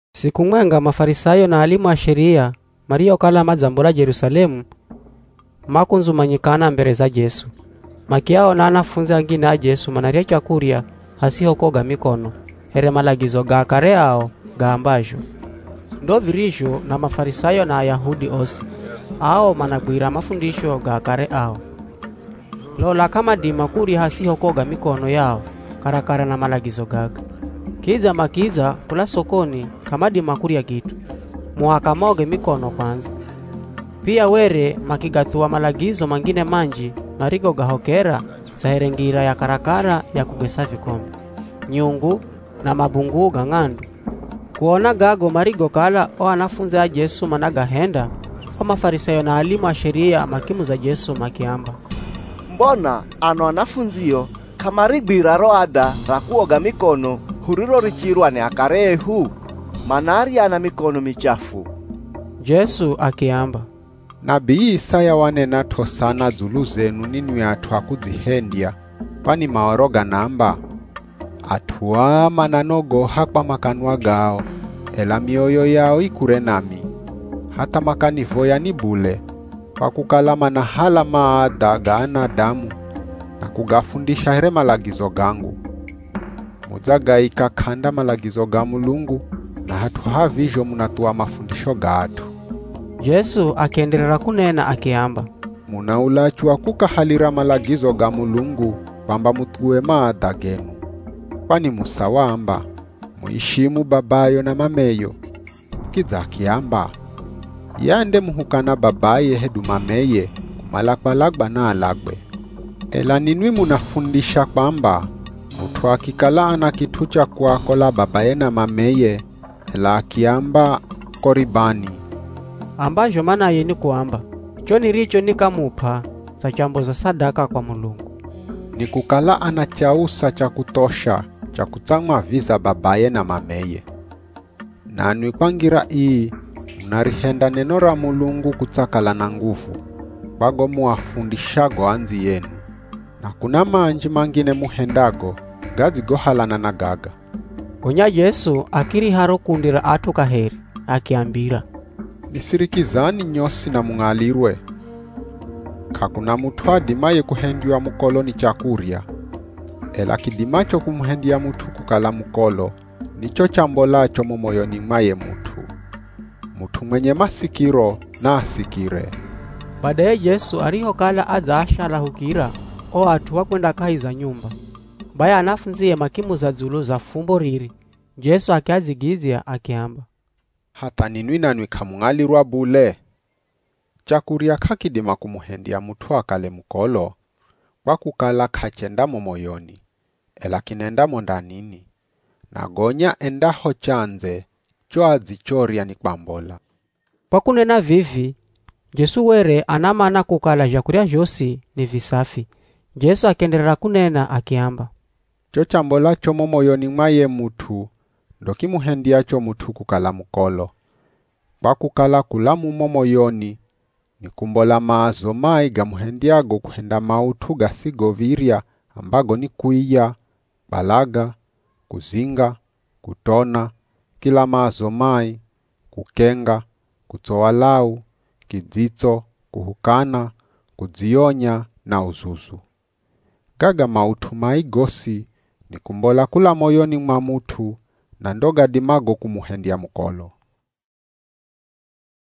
Siku mwenga Mafarisayo na alimu a Sheria mariokala madzambola Jerusalemu, makundzumanyikana mbere za Jesu. Makiaona anafundzi angine a Jesu manarya chakurya hasiho kuoga mikono here malagizo ga akare ao gaambazho. (Ndo virizho na Mafarisayo na Ayahudi osi, ao managwira mafundisho ga akare ao. Lola k'amadima kurya hasiho kuoga mikono yao karakara na malagizo gaga. Kidza makidza kula sokoni k'amadima kurya kit'u, muhaka maoge mikono kwandza. Pia were makigathuwa malagizo mangine manji marigogahokera dza here ngira ya karakara ya kugesa vikombe, nyungu na mabunguu ga ng'andu.) Kuona gago marigokala o anafundzi a Jesu managahenda, o Mafarisayo na alimu a Sheria makimuza Jesu makiamba, “Mbona ano anafundzio k'amarigwira ro adha ra kuoga mikono hurirorichirwa ni akare ehu? Manarya na mikono michafu.” Jesu akiamba, “Nabii Isaya wanenat'o sana dzulu zenu ninwi at'u a kudzihendya, kwani Maoro ganaamba, ‘At'u aa mananogoha kwa makanwa gao, ela mioyo yao i kure nami. Hatha makanivoya ni bule, kwa kukala manahala maadha ga anadamu, na kugafundisha here malagizo gangu.’ Mudzagaika k'anda malagizo ga Mulungu na hat'u ha vizho munathuwa mafundisho ga at'u.” Jesu akienderera kunena akiamba, “Muna ulachu wa kukahalira malagizo ga Mulungu kwamba muthuwe maadha genu. Kwani Musa waamba, ‘Muishimu babayo na mameyo.’ Kidza akiamba, ‘Ye andemuhukana babaye hedu mameye, kumala kwalagwa naalagwe.’ Ela ninwi munafundisha kwamba, mut'u akikala ana kit'u cha kuakola babaye na mameye, ela akiamba ‘Koribani’ ambazho manaye ni kuamba, (Cho niricho nikamup'a dzachamboza sadaka kwa Mulungu), ni kukala ana chausa cha kuthosha cha kutsamwaviza babaye na mameye. Nanwi kwa ngira ii munarihenda neno ra Mulungu kutsakala na nguvu, kwa go muafundishago andziyenu; na kuna manji mangine muhendago gadzigohalana na gaga.” Gonya Jesu akiriha ro kundi ra at'u kaheri akiambira, “Nisirikizani nyosi na mung'alirwe. K'akuna mut'u adimaye kuhendywa mukolo ni chakurya.” (Ela kidimacho kumuhendya mut'u kukala mukolo ni cho chambolacho mo moyoni mwa ye mut'u.) [ Mut'u mwenye masikiro, naasikire.] Badaye Jesu arihokala adzaashalahukira o at'u, wakwenda kahi za nyumba, bai anafundzie makimuza dzulu za fumbo riri. Jesu akiadzigidzya akiamba, “Hatha ninwi nanwi k'amung'alirwa bule? Chakurya k'akidima kumuhendya mut'u akale mukolo, kwa kukala k'achenda mo moyoni, ela kinenda mo ndanini, na gonya endaho chandze cho adzichorya ni kwambola.” (Kwa kunena vivi, Jesu were ana mana kukala zhakurya zhosi ni visafi.) Jesu akienderera kunena akiamba, “Cho chambolacho mo moyoni mwa ye mut'u ndo kimuhendyacho mut'u kukala mukolo, kwa kukala kula mumo moyoni ni kumbola maazo mai gamuhendyago kuhenda maut'u gasigov̱irya ambago ni kuiya, kwalaga, kuzinga, kutona, kila maazo mai, kukenga, kutsowa lau, kidzitso, kuhukana, kudzionya na uzuzu. Gaga maut'u mai gosi ni kumbola kula moyoni mwa mut'u na ndo gadimago kumuhendya mukolo.”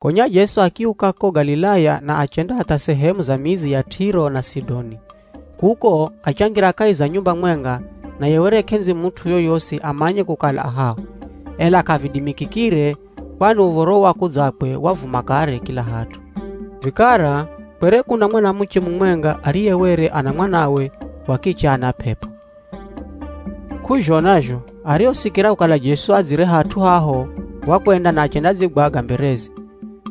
Gonya Jesu akiuka ko Galilaya na achenda hatha sehemu za midzi ya Tiro na Sidoni. Kuko, achangira kahi za nyumba mwenga naye were k'endzi mut'u yoyosi amanye kukala a haho. Ela k'avidimikikire kwani uv̱oro wa kudzakwe wavuma kare kila hat'u. Vikara kwere kuna mwanamuche mumwenga ariye were ana mwanawe wa kiche ana p'ep'o. K'uzhona zho arihosikira kukala Jesu adzire hat'u haho wakwenda na achendadzigwaga mbereze.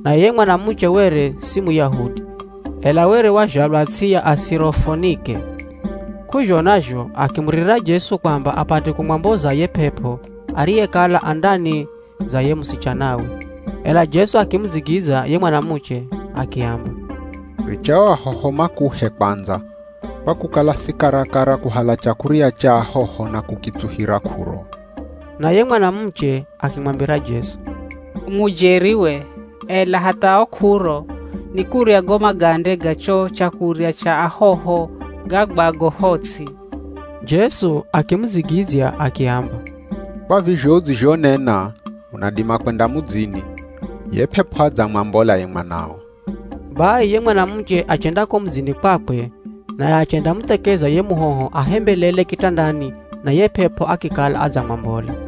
Naye ye mwanamuche were si Muyahudi, ela were wazhalwa ts'i ya Asirofonike. K'uzhona zho akimuririra Jesu kwamba apate kumwamboza ye p'ep'o ariyekala a ndani za ye musichanawe. Ela Jesu akimudzigidzya ye mwanamuche akiamba, “Richa o ahoho makuhe kwandza, kwa kukala si karakara kuhala chakurya cha ahoho na kukitsuhira k'uro.” Naye mwanamuche akimwambira Jesu, “U mujeri we, ela hatha o k'uro, ni kurya go magande ga cho chakurya cha ahoho gagwago ho ts'i.” Jesu akimudzigidzya akiamba, “Kwa vizho udzizhonena, unadima kwenda mudzini, ye p'ep'o adzamwambola ye mwanao.” Bai ye mwanamuche achenda ko mudzini kwakwe naye achendamuthekeza ye muhoho ahembelele kitandani na ye p'ep'o akikala adzamwambola.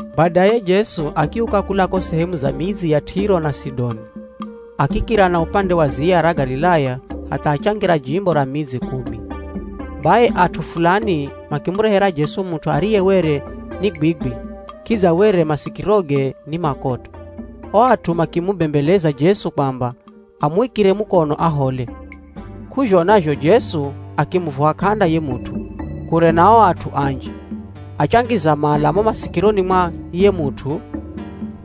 Badaye Jesu akiuka kula ko sehemu za midzi ya Tiro na Sidoni, akikira na upande wa ziya ra Galilaya hatha achangira jimbo ra Midzi Kumi. Bai at'u fulani makimurehera Jesu mut'u ariye were ni gwigwi kidza were masikiroge ni makoto. O at'u makimubembeleza Jesu kwamba amuikire mukono ahole. K'uzhona zho Jesu akimuvuha k'anda ye mut'u, kure na o at'u anji, achangiza mala mo masikironi mwa ye mut'u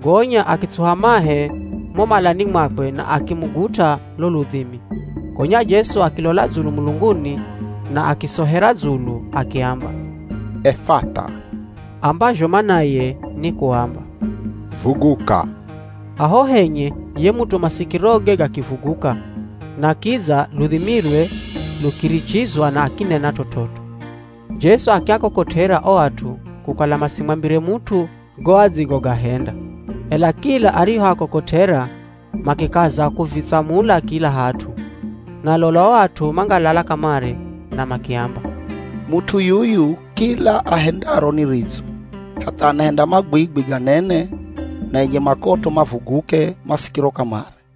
gonya akitsuha mahe mo malani mwakwe na akimugut'a lo ludhimi. Gonya Jesu akilola dzulu mulunguni na akisohera dzulu akiamba, “Efatha” ambazho manaye ni kuamba “Vuguka.” Haho henye ye mut'u masikiroge gakivuguka, na kidza ludhimilwe lukirichizwa na akinena t'ot'ot'o. Jesu akiakokot'era o at'u kukala masimwambire mut'u go adzigogahenda, ela kila arihoakokot'era makikaza kuvitsamula kila hat'u Na lola o at'u mangalala kamare na makiamba, “Mut'u yuyu kila ahendaro ni ridzo, hatha anahenda magwigwi ganene na enye makoto mavuguke masikiro kamare!”